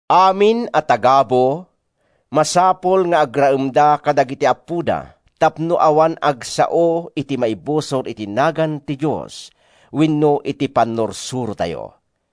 Amin a tagabu, masapul nga agraemda kadagiti appoda tapno awan agsao iti maibusor iti nagan ti Dios wenno iti pannursurotayo.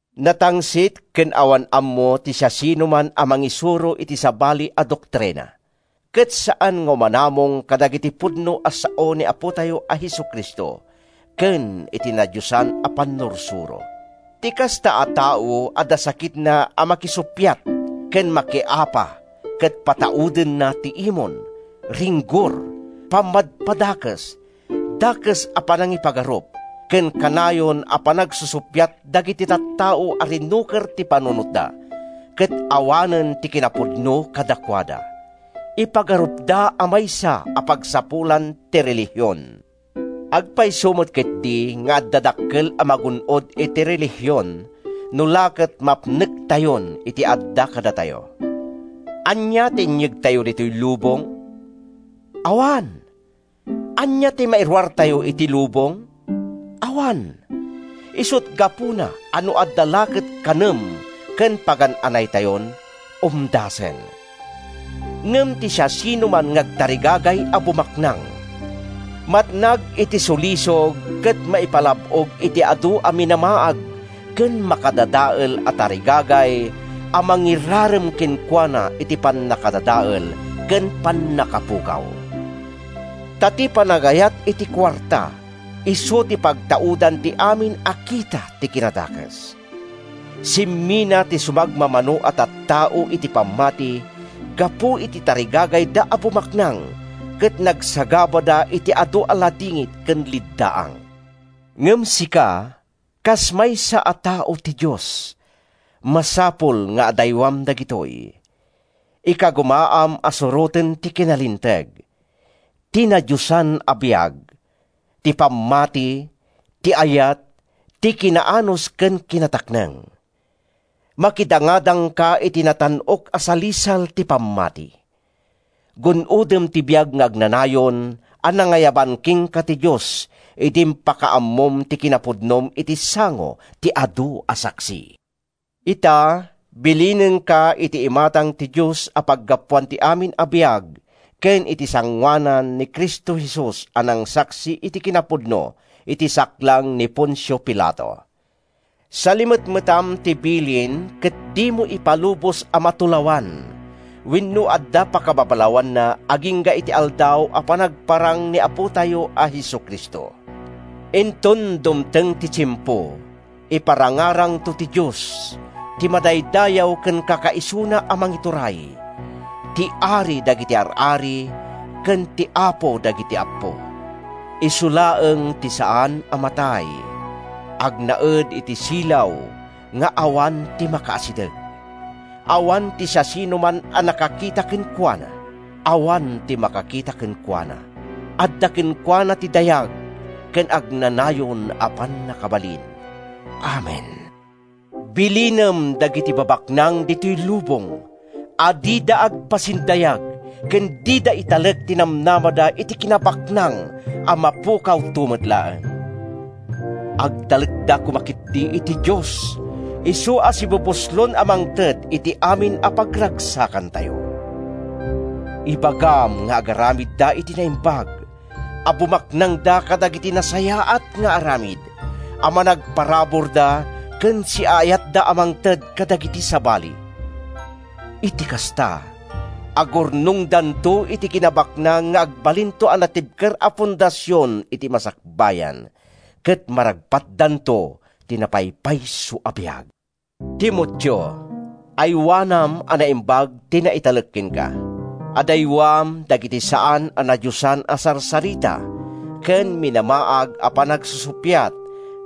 Natangsit ken awan ammo ti siasinoman a mangisuro iti sabali a doktrina, ket saan nga umanamong kadagiti pudno a sao ni Apotayo a Jesu-Cristo ken iti nadiosan a pannursuro. Ti kasta a tao adda sakitna a makisuppiat ken makiapa ket pataudenna ti imon, ringgor, pammadpadakes, dakes a panangipagarup ken kanayon a panagsusuppiat dagiti tattao a rinuker ti panunotda ket awanen ti kinapudno kadakuada. Ipagarupda a maysa a pagsapulan ti relihion. Agpayso met ketdi nga adda dakkel a magun-od iti relihion no la ket mapnektayon iti adda kadatayo. Ania ti inyegtayo ditoy lubong? Awan! Ania ti mairuartayo iti lubong? Awan! Isut’ gapuna a no adda la ket kanen ken pagan-anaytayon, umdasen. Ngem ti siasinoman nga agtarigagay a bumaknang, matnag iti sulisog ket maipalab-og iti adu a minamaag ken makadadael a tarigagay a mangirarem kenkuana iti pannakadadael ken pannakapukaw. Ta ti panagayat iti kuarta isu ti pagtaudan ti amin a kita ti kinadakes. Simmina ti sumagmamano a tattao iti pammati gapu iti tarigagayda a bumaknang ket nagsagabada iti adu a ladingit ken leddaang. Ngem sika, kas maysa a tao ti Dios, masapul nga adaywam dagitoy. Ikagumaam a suroten ti kinalinteg, ti nadiosan a biag, ti pammati, ti ayat, ti kinaanus ken kinatakneng. Makidangadangka iti natan-ok a salisal ti pammati. Gun-odem ti biag nga agnanayon a nangayaban kenka ti Dios idi impakaammom ti kinapudnom iti sango ti adu a saksi. Ita, bilinenka iti imatang ti Dios a paggapuan ti amin a biag ken iti sangoanan ni Cristo Jesus a nangsaksi iti kinapudno iti saklang ni Poncio Pilato: Salimetmetam ti bilin ket dimo ipalubos a matulawan wenno adda pakababalawanna agingga iti Aldaw a panagparang ni Apotayo a Jesu-Cristo. Inton dumteng ti tiempo, iparangarangto ti Dios, ti madaydayaw ken Kakaisuna a Mangituray, ti Ari dagiti ar-ari ken ti Apo dagiti appo. Isu laeng ti saan a matay. Agnaed iti silaw nga awan ti makaasideg. Awan ti siasinoman a nakakita kenkuana. Awan ti makakita kenkuana. Adda kenkuana ti dayag ken agnanayon a pannakabalin! Amen. Bilinem dagiti babaknang ditoy lubong a dida agpaspasindayag ken dida italek ti namnamada iti kinabaknang a mapukawto met laeng. Agtalekda ketdi koma iti Dios, isu a sibubuslon a mangted iti amin a pagragsakantayo. Ibagam nga agaramidda iti naimbag, a bumaknangda kadagiti nasayaat nga aramid, a managparaburda ken siaayatda a mangted kadagiti sabali. Iti kasta, agurnongdanto iti kinabaknang nga agbalinto a natibker a fondasion iti masakbayan, ket maragpatdanto ti napaypayso a biag. Timoteo, aywanam a naimbag ti naitalek kenka. Adaywam dagiti saan a nadiosan a sarsarita ken minamaag a panagsusuppiat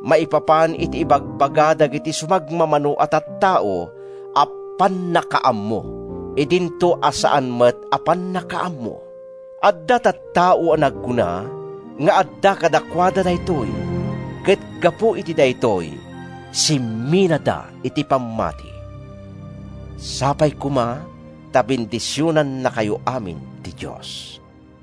maipapan iti ibagbaga dagiti sumagmamano a tattao a “pannakaammo,” idinto a saan met a pannakaammo. Adda tattao a nagkuna nga adda kadakuada daytoy, ket gapu iti daytoy, simminada iti pammati. Sapay koma ta bendisionannakayo amin ti Dios.